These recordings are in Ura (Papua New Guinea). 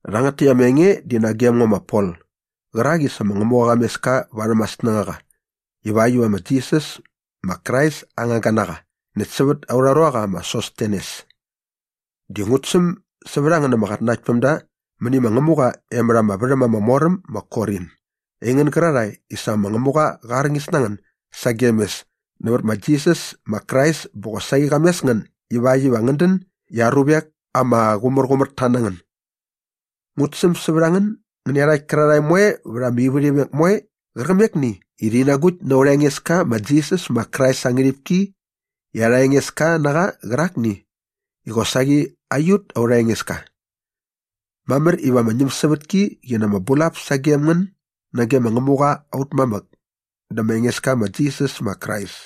Rhangät täkt ama enge di nagem ngo ma Pol qärak i sa ma Ngämuqa qa mes ka varhäm aa snängaqa ivakt iva ma Jisas ma Krais aa ngangga na qa näkt sävät aurha ruaqa ma Sostenes. Dä ngut säm sävät a ngän ama qatnanaktpämda mäni ma Ngämuqa e mät ama värhäm ama mor äm ma Korin, aingän gärarhae i sa ma Ngämuqa qa arñis na ngän sagem mes nävät ma Jisas ma Krais bä qosaqi qa mes ngän ivakt iva ngän dän i aa ruvek ama qumärqumärta na ngän. Ngut säm sävät a ngän ngän nä iarhakt kärarhae moe vät ama ivärhimek moe qärqämekni i rhi nagukt na aurha Engeska ma Jisas ma Krais aa ngärhipki i arha Engeska na qa qärakni i qosaqi aiut aurha Engeska. Mamär iva ama ñämsävätki qi na ama bulap sagem ngän nage ma Ngämuqa aut mamäk dä ma Engeska ma Jisas ma Krais.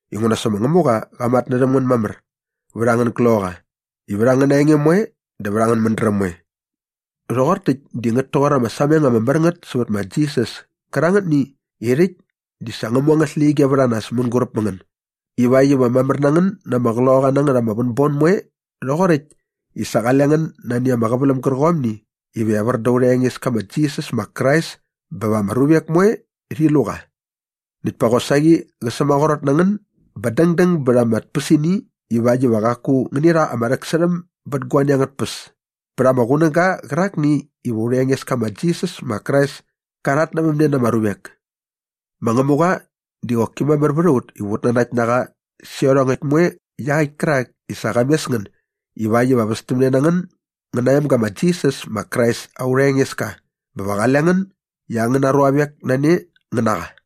inguna sa ma Ngämuqa qa matnärhäm ngän mamär vät angän gloqaqa i vät angäna enge moe dä vät angän mädräm moe. Rhoqor täkt di ngät toqor ama sameng ama mär ngät sävät ma Jisas kärangätni i rhäkt di sa ngä mu angät släqyige vät a nas mänguräp mä ngän ivakt iva mamär na ngän na ama qloqaqa na ngät ama vänbon moe rhoqoräkt i sa qale ngän nani ama qäväläm gärqomni iva evär da aurha Engeska ma Jisas ma Krais bä va ama ruvek moe rhi lu qa. Näkt pa qosaqi qä sämaqrot na ngän bä dängdäng bät ama tpäsini ivakt iva qaku ngäni rha ama rhäksärhäm bät guani angät tpäs pät ama qunäga qärakni iva aurha Engeska ma Jisas ma Krais ka rhatnävämne na ama ruvek. Ma Ngämuqa di qoki mamär vät a ut iva ut nanakt na qa sä iarhongäkt moe iaqäkt kärak i sa qa mes ngän ivakt iva västämne na ngän ngän na aa emga ma Jisas ma Krais aurha Engeska bä va qale ngän i angäna ruavek na ne ngän na qa.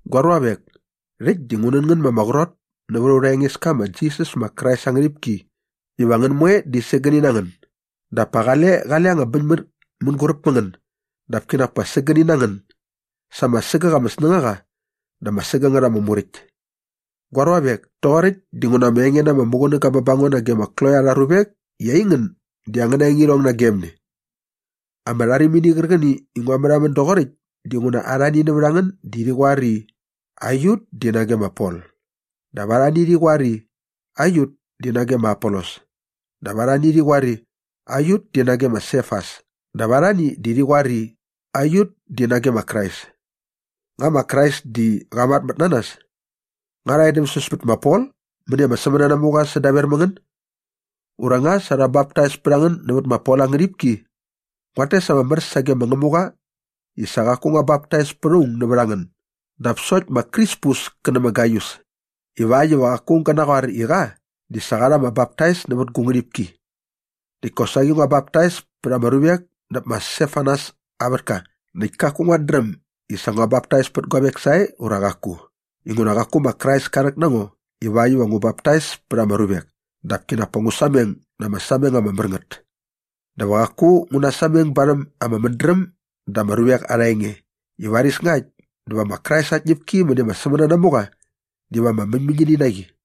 Gua ruavek, rhäkt di ngu nän ngän ma ama qrot nävät aurha Engeska ma Jisas ma Krais aa ngärhipki iva ngän moe di sägäni na ngän dap pa qale qale anga bäñmät mänguräp mä ngän dap kinak pa sägäni na ngän sa ama sägäk ama snängaqa dä ama sägängät ama muräkt. Gua ruavek, toqoräkt dinguna ama enge na ama muqunäga bä ba ngo nage ma Kloe arha ruvek i aingän di angäna engirhong nagem ne. Ama rharimini qärqäni i ngua märhamän doqoräkt dinguna arhani nävät a ngän di rhi qoar i, “Aiut di nage ma Pol” dap arhani di rhi qoar i, “Aiut di nage ma Apolos” dap arhani di rhi qoar i “Aiut di nage ma Sefas” dap arhani di rhi qoar i, “Aiut di nage ma Krais.” Nga ma Krais di qa matmät na nas? Nga rha edämsäs pät ma Pol mäni ama sämänanamuqa sädaver mä ngän? Ura nga sa rha baptais pät a ngän nävät ma Pol aa ngärhipki? Nguat tes ama mär sage ma Ngämuqa i sa qaku ngua baptais pät aung nävät a ngän dap sokt ma Krispus kä nä ma Gaius ivakt iva qaku aung gä naqoar i qa di sa qa rha ama baptais nävät gu ngärhipki. Näkt kosaqi ngua baptais pät ama ruvek näp ma Stefanas aa vätka näkt kaku nguat dräm i sa ngua baptais pät guavek sae ura qaku? Inguna qaku ma Krais ka rhäk na ngo ivakt iva ngu baptais pät ama ruvek dap kinak pa ngu sameng na ama sameng ama mär ngät. Dä va qaku ngu nasameng barhäm ama mädräm da ama ruvek arha enge i varis ngakt dä va ma Krais aa tñäpki mäni ama sämänanamuqa diva ama mäñmäñini na qi.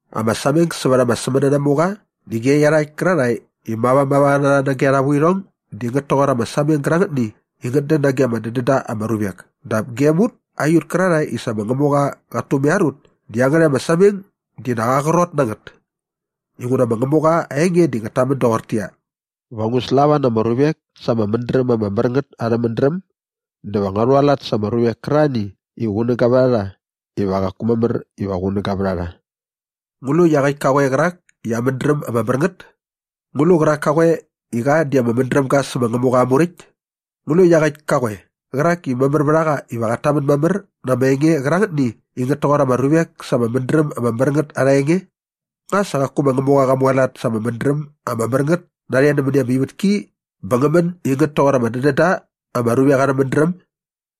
Ama sameng sävät ama sämänanamuqa di ge iarhakt kärarhae i mavamava na rha nage arha vuirhong di ngät toqor ama sameng gärangätni i ngät dän nage ama dädän da ama ruvek dap gem ut aiut kärarhae i sa ma Ngämuqa qat tumaiar ut di iangärhäkt ama sameng di nak aa qrot na ngät. Inguna ma Ngämuqa aa enge di ngät tamän doqortäqyia, “Va ngu slava na ama ruvek sa ama mädräm ama mär ngät arhä mädräm dä va ngua rhualat sa ama ruvek kärarhani i qunäga vät a rha iva qaku mamär iva qunäga vät a rha.” Ngu lu iaqäkt ka qoe qärak i aa mädräm ama mär ngät? Ngu lu qärak ka qoe i qa di ama mädräm ga sä ma Ngämuqa aa Muräkt? Ngu lu iaqäkt ka qoe qärak i mamär vät a qa iva qat tamän mamär na ama enge qärangätni i ngät toqor ama ruvek sa ama mädräm ama mär ngät arha enge? Nga sa qaku ma Ngämuqa qa mualat sa ama mädräm ama mär ngät narhe nämäni ama ivätki bä ngä män i ngät toqor ama dädän da ama ruvek arhä mädräm?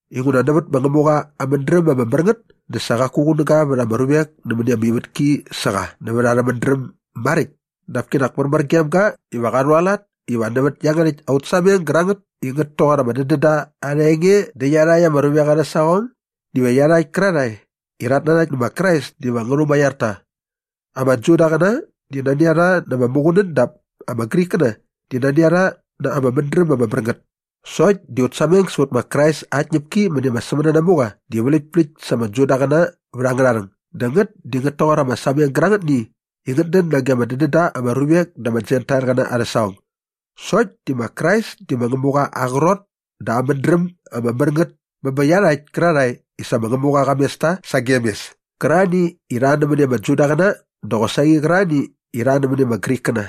Inguna nävät ma Ngämuqa aa mädräm ama mär ngät dä sa qaku qunäga vät ama ruvek nämäni ama ivätki sä qa nävät arhä mädräm maräkt dap kinak märmär gem ga iva qa rhualat iva nävät iangärhäkt aut sameng gärangät i ngät toqor ama dädända arha enge dä iarhakt ama ruvek arhä saqong diva iarhakt kärarhae i rhat nanakt nä ma Krais diva ngä rhumaiar ta. Ama Judaqäna di nani a rha na ama muqunän dap ama Grikkäna di nani a rha na ama mädräm ama mär ngät sokt di aut sameng sävät ma Krais aa tñäpki mäni ama sämänanamuqa di vläktpläkt sa ama Judaqäna vät angärha rhäng dä ngät di ngät toqor ama sameng gärangätni i ngät dän nage ama dädän da ama ruvek da ama Jentailqäna arhä saqong. Sokt di ma Krais di ma Ngämuqa aa qrot dä aa mädräm ama mär ngät bä bä iarhakt kärarhae i sa ma Ngämuqa qa mes ta sagem mes kärarhani i rha nämäni ama Judaqäna dä qosaqi qärarhani i rha nämäni ama Grikkäna.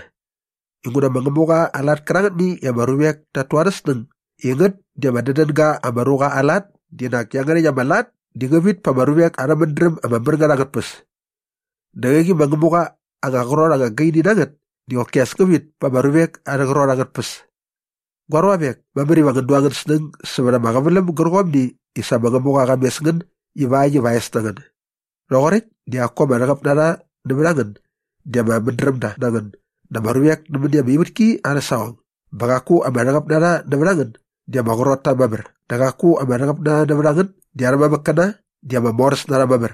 Inguna ma Ngämuqa aa lat kärangätni i ama ruvek tat tu arhä snäng i ngät di ama dädän ga ama ruqa aa lat di nak iangärhäkt ama lat di ngä vit pa ama ruvek arhä mädräm ama mär ngät angät tpäs. Dä qäqi ma Ngämuqa aa anga qrot ama gaini na ngät di qoki as ngä vit pa ama ruvek arhä qrot angät tpäs. Gua ruavek, mamär iva ngän du angän snäng sävät ama qäväläm gärqomni i sa ma Ngämuqa qa mes ngän ivakt iva aa es na ngän. Rhoqoräkt di qaku ama rhäqäp na rha nävät a ngän di ama mädrämda na ngän da ama ruvek nämäni ama ivätki arhä saqong bä qaku ama rhäqäp na rha nävät a ngän di ama qrot ta mamär dä qaku ama rhäqäp na rha nävät a ngän di arhä mamäkkäna di ama moräs na rha mamär.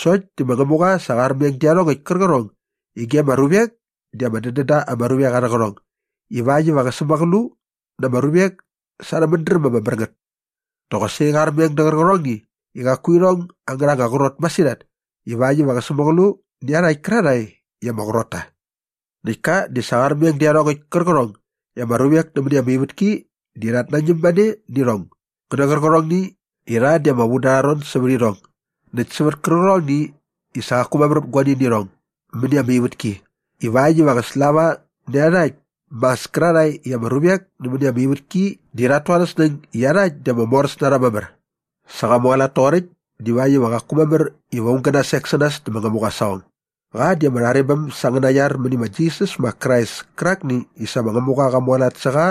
Sokt di ma Ngämuqa sa qa armeng dä iarhongäkt kärqärhong i ge ama ruvek di ama dädän da ama ruvek arhä qärhong ivakt iva qä sämäqlu na ama ruvek sa ama mädräm ama mär ngät. Dä qosaqi qa armeng dä qärqärhongni i qaku irhong angärha anga qrot masirhat ivakt iva qä sämäqlu nä iarhakt kärarhae i ama qrot ta. Näkt ka di sa qa armeng dä iarhongäkt kärqärhong i ama ruvek nämäni ama ivätki di rhat nañäm mane nä irhong ngä nä qärqärhongni i rha di ama vu da arha ron sävät irhong näkt sävät kärqärhongni i sa qaku mamär vät guani nä irhong mäni ama ivätki ivakt iva qä slava nä iarhakt mas kärarhae i ama ruvek nämäni ama ivätki di rhat tu arhä snäng i iarhakt di ama moräs na rha mamär. Sa qa mualat toqoräkt divakt iva qaku mamär iva aung gä nasek sä nas dä ma Ngämuqa aa saqong. Qa di ama rharebäm sa angäna iar mäni ma Jisas ma Krais kärakni i sa ma Ngämuqa qa mualat sä qa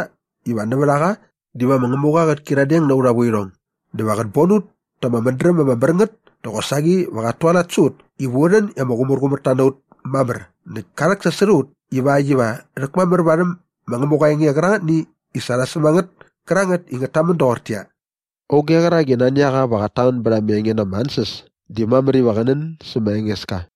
iva nävät a qa diva ma Ngämuqa qät kyiradeng na aurha vuirhong dä va qät bon ut ta ama mädräm ama mär ngät dä qosaqi va qat tualat sä ut iva u rhän i ama qumärqumärta na ut mamär näkt ka rhäksasot a ut ivakt iva rhäkmamär varhäm ma Ngämuqa aa enge qärangätni i sa rha säm a ngät kärangät i ngät tamän doqortäqyia, “Auge qärak i nani a qa iva qat tamän bät ama enge na ama ansänas di mamär iva qä nän sä ma Engeska.”